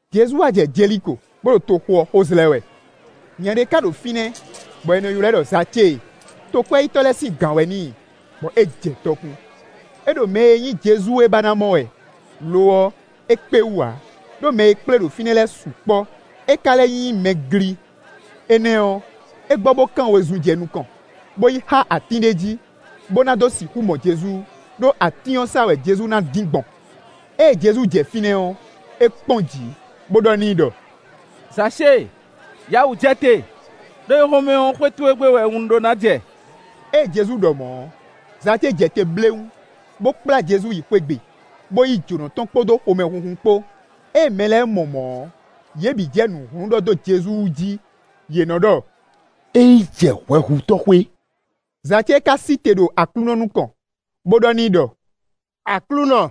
Jezu wá jɛ Jeliko, bó ɖo toxo ɔ́ xo zlɛ́ wɛ. Nya ɖé ka ɖo fínɛ́, bɔ è nɔ ylɔ́ ɛ ɖɔ Zacée: tokwɛ́yítɔ́ lɛ́ɛ sín gǎn wɛ n'i, bɔ é jɛ dɔkun. É ɖo mɛ e nyí Jezu é ba ná mɔ wɛ; lo ɔ́, é kpé wú ǎ, ɖó mɛ e kplé ɖo fínɛ́ lɛ́ɛ sukpɔ́, é ka lɛ́ nyí mɛ gli. Énɛ́ ɔ́, é gbɔ bó kán wezun jɛ nukɔn, bó yi xá atín ɖé jí, bó na dó sixú mɔ Jezu, ɖó atín ɔ́ sá wɛ Jezu ná dín gbɔn. Ée Jezu jɛ fínɛ́ ɔ́, é kpɔ́n jǐ, bó ɖɔ n'i ɖɔ: “Zacée, yǎ wǔ jɛ te; ɖó éhɔ́nmɛ ɔ́, xwé towe gbe wɛ un ɖó ná jɛ.” Ée Jezu ɖɔ mɔ̌ ɔ́, Zacée jɛ te bléwún, bó kplá Jezu yi xwé gbe, bó yí jǒnɔ tɔn kpódó xomɛhunhun kpó. Ée mɛ lɛ́ɛ mɔ mɔ̌ ɔ́, yě bǐ jɛ nǔ hlún ɖɔ dó Jezu wú jí; yě nɔ́ ɖɔ: “É yi jɛ hwɛhutɔ́ xwé!” Zacée ka sí te ɖo Aklúnɔ nukɔn, bó ɖɔ n'i ɖɔ: “Aklúnɔ!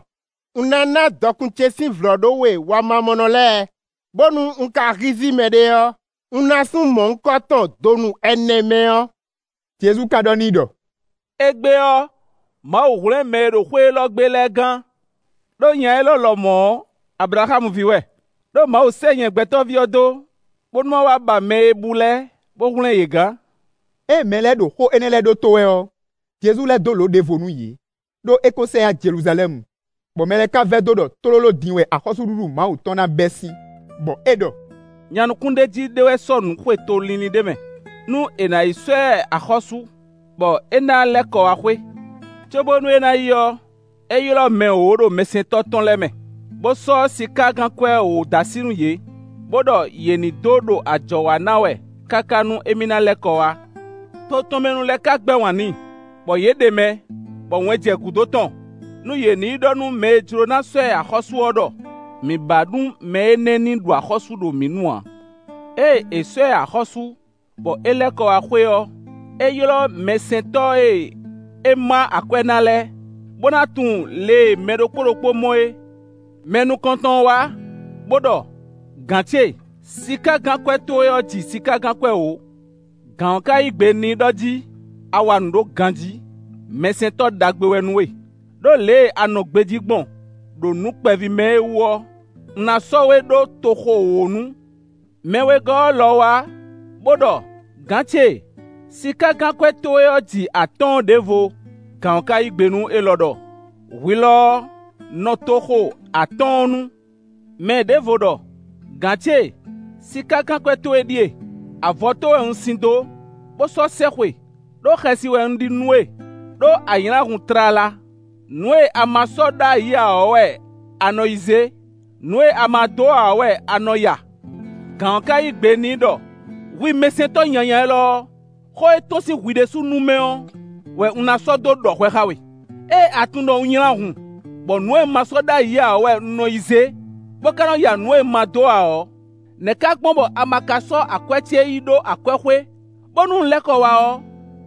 Un ná ná dɔkun ce sín vlɔ̌ɖówe wamamɔnɔ lɛ́ɛ, bónú un ka hízí mɛɖé ɔ́, un ná sú mɔ̌hunkɔtɔn donu ɛnɛ mɛ ɔ́.” Jezu ka ɖɔ n'i ɖɔ: “Égbé ɔ́, Mawu hwlɛ́n mɛ e ɖo xwé élɔ́ gbe lɛ́ɛ gán, ɖó nya élɔ́ lɔmɔ̌ ɔ́, Ablaxámu ví wɛ.” Đó Mawu sɛ́ nyɛ Gbɛtɔ́ví ɔ́ dó, bónú má wá ba mɛ e bú lɛ́ɛ, bó hwlɛ́n yě gán. Ée mɛ lɛ́ɛ ɖo xó énɛ́ lɛ́ɛ ɖótó wɛ ɔ́, Jezu lɛ́ dó lǒ ɖěvo nú yě, ɖó é ko sɛ yá Jeluzalɛ́mu, bɔ mɛ lɛ́ɛ ka vɛdó ɖɔ tlóló din wɛ axɔ́súɖuɖu Mawu tɔn ná bɛ́ sín. Bɔ é ɖɔ: “Nya nukúnɖéjí ɖé wɛ sɔ́nǔ xwe to línlín ɖé mɛ, nú è nǎ yi sɔ́ ɛ axɔ́sú, bɔ é ná lɛ́ kɔ wá xwé. Cóbónú é ná yi ɔ́, é ylɔ́ mɛ wǒ ɖo mɛsɛntɔ́ tɔn lɛ́ɛ mɛ, bó sɔ́ sikágankwɛ́ wǒ dó así nú yě, bó ɖɔ yě ní dó ɖo ajɔ̌ wa ná wɛ, káká nú émí na lɛ́ kɔ wá. To tɔn mɛ nu lɛ́ɛ ka gbɛ́ wǎn n'i, bɔ yě ɖe mɛ, bɔ wɛn jɛ gǔdo tɔn nú yě ní yi ɖɔ nú mɛ e jló ná sɔ́ ɛ axɔ́sú ɔ́ ɖɔ: ‘Mǐ ba nú mɛ énɛ́ ní ɖu axɔ́sú ɖo mǐ nu ǎ!’ “Ée è sɔ́ ɛ axɔ́sú, bɔ é lɛ́ kɔ wá xwé ɔ́, é ylɔ́ mɛsɛntɔ́ e é má akwɛ́ ná lɛ́ɛ, bó ná tunwun lě e mɛ ɖokpó ɖokpó mɔ é. Mɛ nukɔntɔn ɔ́ wá, bó ɖɔ: ‘Gǎn ce, sikágankwɛ́ towe ɔ́ ji sikágankwɛ́ wǒ.’ Gǎn ɔ́ ka yí gbe n'i ɖɔ jí: ‘A wa nǔ ɖó ganjí; mɛsɛntɔ́ ɖagbe wɛ nú we; ɖó lě e a nɔ gbejí gbɔn, ɖo nǔ kpɛví mɛ é wú ɔ́, un ná sɔ́ we ɖó toxo wǒ nu.’ Mɛ wegɔ́ ɔ́ lɔ wá, bó ɖɔ: ‘Gǎn ce, sikágankwɛ́ towe ɔ́ ji atɔ́ɔ́n ɖěvo.’ Gǎn ɔ́ ka yí gbe nú élɔ́ ɖɔ: ‘Hwi lɔ ɔ́, nɔ toxo atɔ́ɔ́n nu.’ Mɛ ɖěvo ɖɔ: ‘Gǎn ce, sikágankwɛ́ towe ɖíe; avɔtó wɛ un sin dó, bó sɔ́ sɛxwe; ɖó xɛsi wɛ un ɖi nú we, ɖó a nylá hun tlala; nǔ e a ma sɔ́ ɖó ayǐ ǎ ɔ́ wɛ a nɔ yi zé; nǔ e a ma dó ǎ ɔ́ wɛ a nɔ ya.’ Gǎn ɔ́ ka yí gbe n'i ɖɔ: ‘Hwi mɛsɛntɔ́ nyanya élɔ́ ɔ́, xó e tɔ́n sín hwi ɖésú nu mɛ ɔ́ wɛ un ná sɔ́ dó ɖɔ hwɛ xá we. Ée a tunwun ɖɔ un nylá hun, bɔ nǔ e un ma sɔ́ ɖ'ayǐ ǎ ɔ́ wɛ un nɔ yi zé, bó ka nɔ ya nǔ e un ma dó ǎ ɔ́, nɛ́ ka gbɔn bɔ a ma ka sɔ́ akwɛ́ ce yi ɖó akwɛ́xwé, bónú un lɛ́ kɔ wá ɔ́,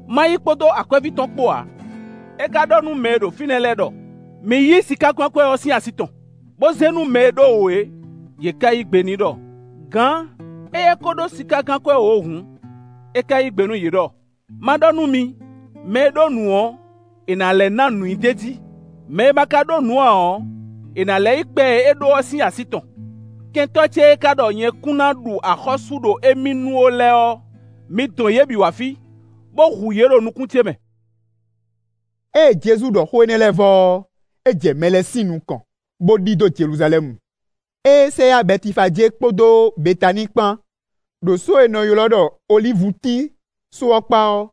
ma yí kpódó akwɛ́ví tɔn kpo ǎ?’ É ka ɖɔ nú mɛ e ɖo fínɛ́ lɛ́ɛ ɖɔ: ‘Mi yí sikágankwɛ́ ɔ́ sín así tɔn, bó zé nú mɛ e ɖó wǒ é!’ Yě ká yí gbe n'i ɖɔ: ‘Gǎn! Éyɛ́ ko ɖó sikágankwɛ́ wǒ hǔn!’ É ka yí gbe nú yě ɖɔ: ‘Má ɖɔ nú mi, mɛ e ɖó nǔ ɔ́, è nǎ lɛ́ ná nǔ i d'é jí. Mɛ e ma ka ɖó nǔɖé ǎ ɔ́, è nǎ lɛ́ yí kpɛ e é ɖó ɔ́ sín así tɔn. Kɛntɔ́ ce e ka ɖɔ nyɛ kún ná ɖu axɔ́sú ɖo émí nu ó lɛ́ɛ ɔ́, mi dɔn yě bǐ wá fí, bó hu yě ɖo nukún ce mɛ.’” Ée Jezu ɖɔ xó énɛ́ lɛ́ɛ vɔ ɔ́, é jɛ mɛ lɛ́ɛ sín nukɔn, bó ɖidó Jeluzalɛ́mu. Ée é sɛ yá Bɛtifajée kpódó Betaníi kpan, ɖo só e è nɔ ylɔ́ ɖɔ olívutín só ɔ́ kpá ɔ́,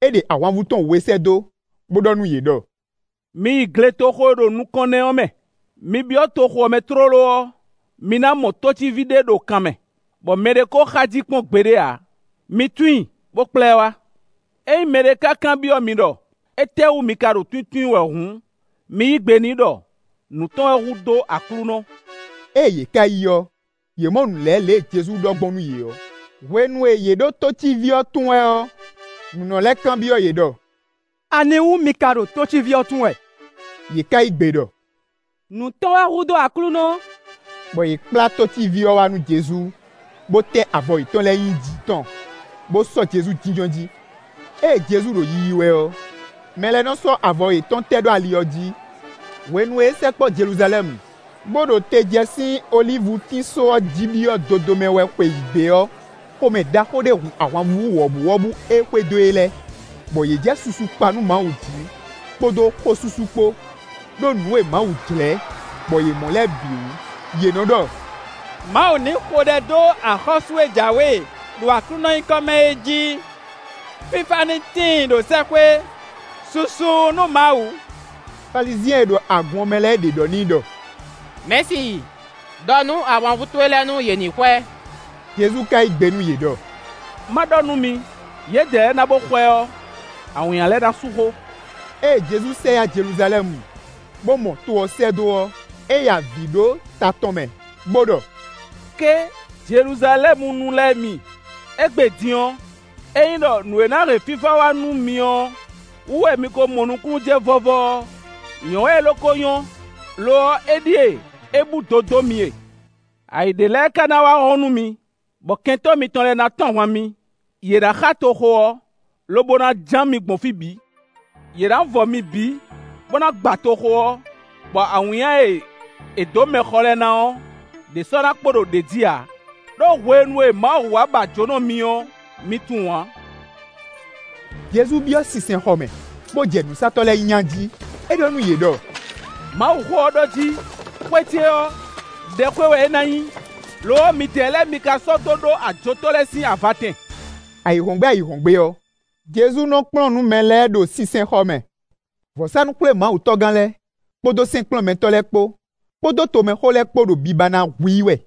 é ɖe ahwanvú tɔn we sɛ́ dó, bó ɖɔ nú yě ɖɔ: “Mi yi gletoxo e ɖo nukɔn nɛ́ é mɛ; mi byɔ́ toxo ɔ́ mɛ tlóló ɔ́, mi ná mɔ tócíví ɖé ɖo kan mɛ, bɔ mɛɖé ko xá jí kpɔ́n gbeɖé ǎ. Mi tún i, bó kplá ɛ wá. Ényí mɛɖé ka kanbyɔ́ mi ɖɔ: ‘Étɛ́wú mi ka ɖo túntún i wɛ’ hǔn, mi yí gbe n'i ɖɔ: ‘Nǔ tɔn wɛ hu dó Aklúnɔ.’” Ée yě ká yi ɔ́, yě mɔ nǔ lɛ́ɛ lě Jezu ɖɔ gbɔn nú yě ɔ́. Hwenu e yě ɖo tócíví ɔ́ tún wɛ ɔ́, nǔnɔ lɛ́ɛ kanbyɔ́ yě ɖɔ: “Aniwú mi ka ɖo tócíví ɔ́ tún wɛ?” Yě ká yí gbe ɖɔ: “Nǔ tɔn wɛ hu dó Aklúnɔ!” Bɔ yě kplá tócíví ɔ́ wá nú Jezu, bó tɛ́ avɔ yětɔn lɛ́ɛ nyi jǐ tɔn, bó sɔ́ Jezu jínjɔ́n jí. Ée Jezu ɖo yiyi wɛ ɔ́, mɛ lɛ́ɛ nɔ sɔ́ avɔ yětɔn tɛ́ ɖó ali ɔ́ jí. Hwenu e é sɛkpɔ́ Jeluzalɛ́mu, bó ɖo te jɛ sín olívutín só ɔ́ jí byɔ́ dodomɛ wɛ xweyǐgbe ɔ́, xomɛ ɖaxó ɖé hun ahwanvú wɔ̌buwɔ́bú e xwedó e lɛ́ɛ, bɔ yě jɛ susu kpa nú Mawu jí kpódó xósúsú kpó, ɖó nǔ e Mawu jlɛ́, bɔ yě mɔ lɛ́ɛ bǐ wú. Yě nɔ́ ɖɔ: “Mawu ní xo ɖɛ dó axɔ́sú e jǎwe ɖo Aklúnɔ nyíkɔ mɛ é jí. Fífá ní tíin ɖo sɛ́xwé, susu nú Mawu.” Falizyɛn e ɖo agun ɔ́ mɛ lɛ́ɛ ɖě ɖɔ n'i ɖɔ: “Mɛ̌si, ɖɔ nú ahwanvú towe lɛ́ɛ nú yě ní xwɛ!” Jezu ka yí gbe nú yě ɖɔ: “Má ɖɔ nú mi: yědɛɛ lɛ́ɛ na bó xwɛ ɔ́, awǐnnya lɛ́ɛ ná sú xó.” Ée Jezu sɛ yá Jeluzalɛ́mu, bó mɔ to ɔ́ sɛ́ dó ɔ́, é ya avǐ ɖó ta tɔn mɛ, bó ɖɔ: “Ké, Jeluzalɛ́munu lɛ́ɛ mi! Égbé din ɔ́, ényí ɖɔ nǔ e ná hɛn fífá wá nú mi ɔ́ wú wɛ mi ko mɔ nukúnnú jɛ vɔ́vɔ́ ɔ́, nyɔ̌ wɛ é lo ko nyɔ́. Lo ɔ́, éɖíe é búdo dó mi e. Ayǐ ɖé lɛ́ɛ ka ná wá hɔ́n nú mi, bɔ kɛntɔ́ mitɔn lɛ́ɛ ná tɔ́n ahwan mi; yě ná xá toxo ɔ́, lobo ná ján mi gbɔn fí bǐ. Yě ná vɔ mi bǐ, bó ná gba toxo ɔ́, bɔ awǐnnya e è dǒ mɛ xɔ lɛ́ɛ ná ɔ́, ɖě sɔ́ ná kpo ɖo ɖě jí ǎ; ɖó hwenu e Mawu wá ba jǒnɔ mi ɔ́, mi tunwun ǎ.” Jezu byɔ́ sinsɛnxɔ mɛ, bó jɛ nǔsatɔ́ lɛ́ɛ nya jí; é ɖɔ nú yě ɖɔ: “Mawuxó ɔ́ ɖɔ jí: ‘Xwé ce ɔ́, ɖɛxwé wɛ é ná nyí; lo ɔ́, midɛɛ lɛ́ɛ mi ka sɔ́ dó ɖó ajotɔ́ lɛ́ɛ sín avatɛn.’” Ayǐhɔ́ngbe ayǐhɔ́ngbe ɔ́, Jezu nɔ kplɔ́n nǔ mɛ lɛ́ɛ ɖo sinsɛnxɔ mɛ; vɔ̌sánú-xwlémawutɔ́gán lɛ́ɛ, kpódó sɛ́nkplɔ́nmɛtɔ́ lɛ́ɛ kpó, kpódó tomɛxó lɛ́ɛ kpó ɖo biba ná hu i wɛ.